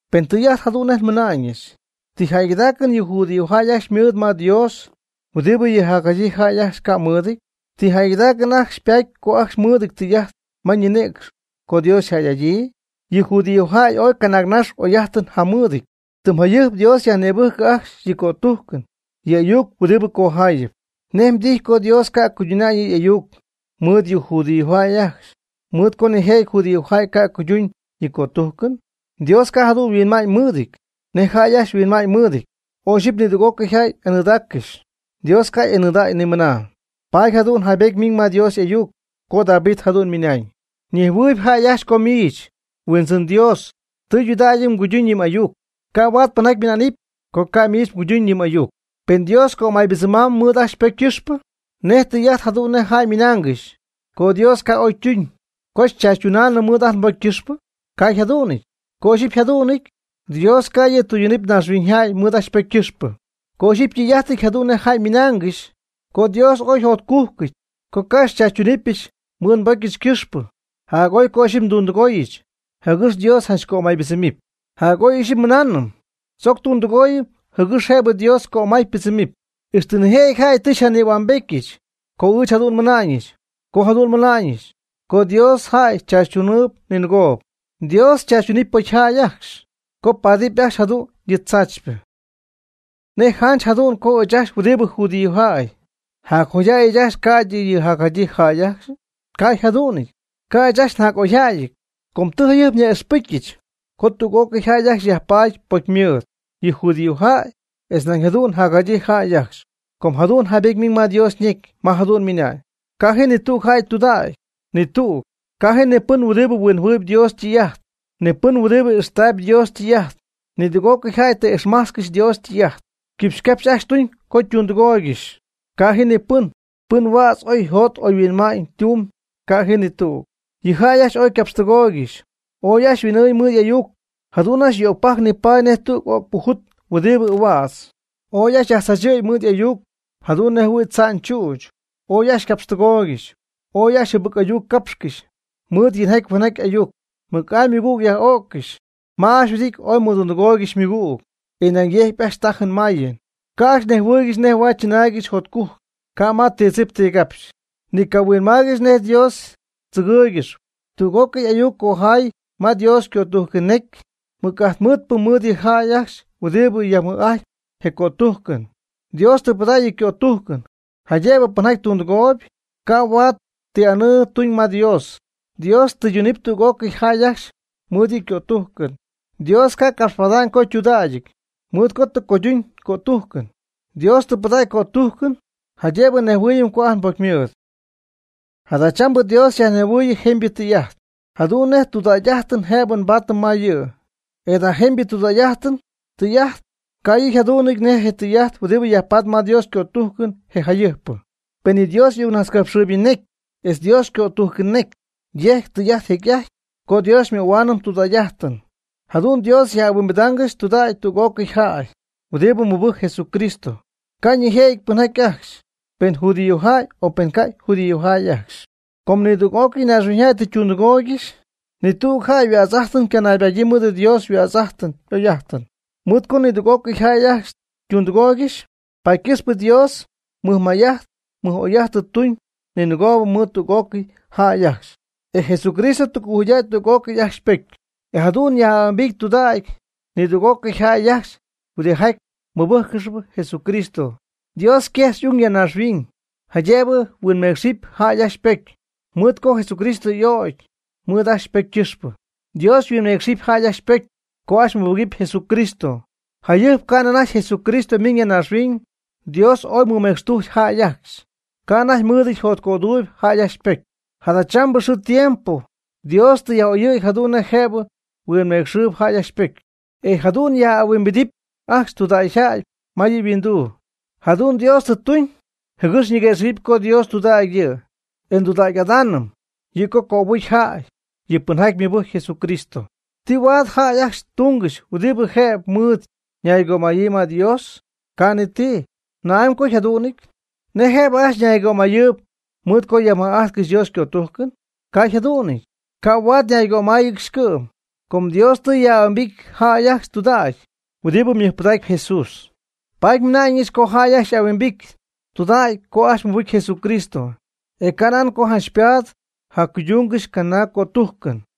Pen tɨy'ajt jadu'n nej nmɨna'ñɨch, ¿ti jäygɨdaacɨn yɨ judíojäy ajcxy ymɨɨd ma Dios huɨdibɨ yɨ jacjadyii jäy ajcxy ca' mɨɨdɨty? ¿Ti jäygɨdaacɨn ajcxy ypatpy co ajcxy mɨɨdɨty tɨy'ajt ma ñinïcx co Dios yjäy'adyii? Yɨ judíojäy ooy canaagnax oy'ajtɨn jamɨɨdɨty. Tɨm jayɨjp Dios yajnïbɨjcɨ ajcxy yɨ' ycötujcɨn yɨ' y'ayuc huɨdibɨ cojaayɨp. ¿Nej mdijy co Dios ca' cuyduna'ñ yɨ' y'ayuc mɨɨd yɨ judíojäy ajcxy mɨɨd co nijëjɨty judíojäy ca' cuyduñ yɨ' ycötujcɨn? Dios ca' jadu'n huinma'ñ mɨɨdɨty nej jäy ajcxy huinma'ñ mɨɨdɨty. Oy ixyipy nidüg'ócɨy jäy y'anɨɨdaaccɨxy, Dios ca' y'anɨɨdäga'ñ nimɨna. Paady jadu'n jaybety miiñ ma Dios y'ayuc co David jadu'n ymɨnañ: Ñejhuɨ̈huɨpy jäy ajcxy co miich, Huindzɨn Dios, tudägy mguyduñ yɨ m'ayuc. Ca' huaad pɨnjaty ymɨna'nɨp co ca' miich mguyduñ yɨ m'ayuc. Pen Dios cömaybɨdzɨmɨpy mɨɨd ajt nbocy ycɨxpɨ, ¿nej tɨy'ajt jadu'n nej jäy ymɨnaangɨxy co Dios ca' oy ytuñ, co xychaachytuunɨm mɨɨd ajt nbocy ycɨxpɨ? Ca' yjadu'nɨty. Co ixyipy yjadu'nɨty, Dios ca' yɨ' tɨydunɨpy naaxhuiñyjäy mɨɨd ajcxy ypocy ycɨxpɨ. Co ixyipy ytɨy'ajtɨty jadu'n nej jäy ymɨnaangɨxy co Dios ooy yjotcujcɨty co ca' xychaachytunɨpyɨch mɨɨd nbocyɨch ycɨxpɨ, jac'oy co ixyipy ndundɨgooyɨch, jɨgɨx Dios janch ycömaybɨdzɨmɨpy. Jac'oy ixyipy nmɨnaanɨm: “Tzoc tundɨgooyɨm jɨgɨx jëbɨ Dios cömay ypɨdzɨmɨpy.” Ixtɨ nijëjɨty jäy tɨ xyñïhuambetyɨch co ɨɨch jadu'n tɨ nmɨna'ñɨch. Ca' jadu'n nmɨna'ñɨch co Dios jäy tzaachytunɨpy ninɨgoob. Dios chaachytunɨpy pocyjäy ajcxy, com paatɨp ajcxy jadu'n yɨ tzaachypɨ. ¿Nej janch jadu'n co ɨɨch ajcxy huɨdibɨ judíojäy, jac'oyjäy ɨɨch ajcxy ca'ydɨ yɨ jacjadyii jäy ajcxy? Ca' yjadu'nɨty, ca' ɨɨch ajcxy njac'oyjäyɨty. Com tɨ jayɨjp nyaj'ixpɨcyɨch co tüg'ócɨy jäy ajcxy yajpaady pocymɨɨd, yɨ judíojäy, etz nañ jadu'n jacjadyii jäy ajcxy. Com jadu'n jaybety miiñ ma Dios ñecy ma jadu'n ymɨna'ñ: Ca' ji ni tüg jäy tudäcpy, ni tüg. Ca' ji ni pɨn huɨdibɨ huinjɨhuɨɨyb Dios ytɨy'ajt. Ni pɨn huɨdibɨ ixtaayb Dios ytɨy'ajt. Nidüg'ócɨy jäy tɨ ixmajtzcɨxy Dios ytɨy'ajt. Quipxy ycapxy ajcxy ytumyb co ytundɨgooygɨxy. Ca' ji ni pɨn, pɨn huädz oy yjot oy yhuinma'ñ tumb, ca' ji ni tüg. Yɨ jäy ajcxy ooy ycapxtɨgooygɨxy, oy ajcxy yhuin'ɨɨñ mɨɨd y'ayuc. Jadu'n ajcxy yöcpajc nipaady nej tüg öcpɨ jut huɨdibɨ ahuädz. Ooy ajcxy yajtzachɨ̈y mɨɨd y'ayuc jadu'n nej jɨhuɨ̈y tza'ñ chüch. Ooy ajcxy ycapxtɨgooygɨxy. Ooy ajcxy jɨbɨc ayuc capxcɨxy. Mɨɨd yinjaty huenjatypɨ ayuc, mɨc'amy ymɨgüg yaj'o'ccɨxy. Ma ajcxy yhuɨdity ooy mɨdundɨgooygɨxy ymɨgüg, e nañ yecy ajcxy tajɨn mayɨn. Ca' ajcxy nejhuɨɨygɨxy nej huaad chɨnaaygɨxy jotcujc, ca' ma ti tzip ti capxy. Ni cahuinmaaygɨxy nej Dios tzɨgɨ́ɨygɨxɨpy. Tüg'ócɨy ayuc ycojaayɨty ma Dios ycötujcɨn necy, mɨc'ajt mɨɨdpɨ mɨɨd yɨ jäy ajcxy huɨdibɨ yajmɨj'ajtp je cötujcɨn. Dios tɨ pɨdägy yɨ' ycötujcɨn, jaydëbɨ pɨnjaty tundɨgooyb, huaad ca' ti anɨɨ tuñ ma Dios. Dios ytɨydunɨpy tüg'ócɨy jäy ajcxy mɨɨd yɨ' ycötujcɨn. Dios ca' capxpada'ñ co ytudägyɨty, mɨɨd co tɨ cuydunyii ycötujcɨn. Dios tɨ pɨdägy ycötujcɨn jaydëbɨ nejhuɨɨyɨm co ajt nbocymɨɨdɨty. Jadachambɨ Dios xyajnejhuɨɨyɨm jemybɨ tɨy'ajt jadu'n nej tudägy'ajtɨn jëb nbaatɨm ma yɨ', e jada jemybɨ tudägy'ajtɨn tɨy'ajt, ca' yɨ' yjadu'nɨty nej yɨ tɨy'ajt huɨdibɨ yajpatp ma Dios ycötujcɨn jecy'ajtpyɨ. Per yɨ Dios y'ayucnajtzcapxɨɨybɨ ñecy etz Dios ycötujcɨn necy yejc tɨy'ajt jecy'ajty co Dios xymöhuaanɨm tudägy'ajtɨn. Jadu'n Dios yaj'ahuimbidaangɨxy tudägy tüg'ócɨy jäy huɨdibɨ mɨbɨjcp Jesucristo, ca' ñejɨty pɨnjäy ajcxy, pen judíojäy o pen ca' judíojäy ajcxy. Com nidüg'ócɨy naaxhuiñyjäy tɨ ytundɨgooygɨxy. Ni tüg jäy yhuädz'ajtɨn ycanaybadyii mɨɨd Dios yhuädz'ajtɨn y'oy'ajtɨn. (Mɨɨd co nidüg'ócɨy jäy ytundɨgooygɨxy), paady ycɨxpɨ Dios mɨjmay'ajt mɨj'oy'ajt tuñ ninɨgoob mɨɨd tüg'ócɨy jäy ajcxy, e Jesucristo tɨ cojuydäy tüg'ócɨy ajcxy ypocy, e jadu'n yaj'ahuimbity tudägy nidüg'ócɨy jäy ajcxy huɨdijaty mɨbɨjccɨxp Jesucristo. Dios yquejx y'ung ya naaxhuiñ, jaydëbɨ huinmeecxɨp jäy ajcxy ypocy, mɨɨd co Jesucristo tɨ y'ögy mɨɨd ajcxy ypocy ycɨxpɨ. Dios yhuinmeecxɨp jäy ajcxy ypocy co ajcxy mɨbɨgɨpy Jesucristo. Jayɨjp ca'nɨ anajty Jesucristo miiñ ya naaxhuiñ, Dios ooy mɨmecxtujcy jäy ajcxy, ca' anajty mɨɨdɨty jotcöduuyb jäy ajcxy ypocy. Jadachambɨ xɨɨ tiempo Dios tɨ yaj'oyɨ̈y jadu'n nej jëb huinmeecxɨpy jäy ajcxy ypocy, e jadu'n yaj'ahuimbidip ajcxy tudägy ma yɨ' yhuinduu. Jadu'n Dios tuñ jɨgɨx ñiguëxɨ̈gɨpy co Dios tudägy yɨ', e tudägy'adaamnɨ yɨ', co cöbɨcy jäy, yɨ pɨnjaty mɨbɨjcp Jesucristo. ¿Ti huaad jäy ajcxy tungɨxy huɨdibɨ jëbɨ mɨɨd ñaygömayɨɨyb ma Dios? Ca' ni ti. ¿Na'amy co yjadu'nɨty? ¿Nej jëbɨ ajcxy ñaygömayɨɨyb mɨɨd co yajmɨj'ajtcɨxy Dios ycötujcɨn? Ca' yjadu'nɨty. Ca' huaad ñaygömáyɨgɨxy cɨ'm, com Dios tɨ yaj'ahuimbity jäy ajcxy tudägy huɨdibɨ mɨjpɨdacp Jesús. Paady nmɨna'ñɨch co jäy ajcxy y'ahuimbity tudägy co ajcxy mɨbɨcy Jesucristo, e canan co janch ypaad jacuydungɨxy canaag cötujcɨn.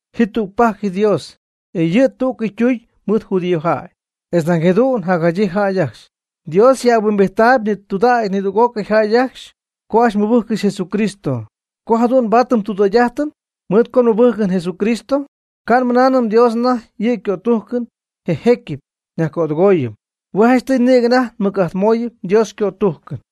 Ji tügpajc Dios, e yɨ' tú'cɨy ytuñ mɨɨd judíojäy, etz nañ jadu'n jacjadyii jäy ajcxy. Dios yaj'ahuimbijtaayb tudägy nidüg'ócɨy jäy ajcxy co ajcxy mɨbɨjccɨxy Jesucristo. Co jadu'n nbaatɨm ndudägy'ajtɨn mɨɨd co nmɨbɨjcɨm Jesucristo, ca' nmɨnaanɨm Dios anajty yɨ' ycötujcɨn je jecyɨp nyajcödɨgooyɨm. Hue' janchtɨy nïgɨ anajty nmɨc'ajtmooyɨm Dios ycötujcɨn.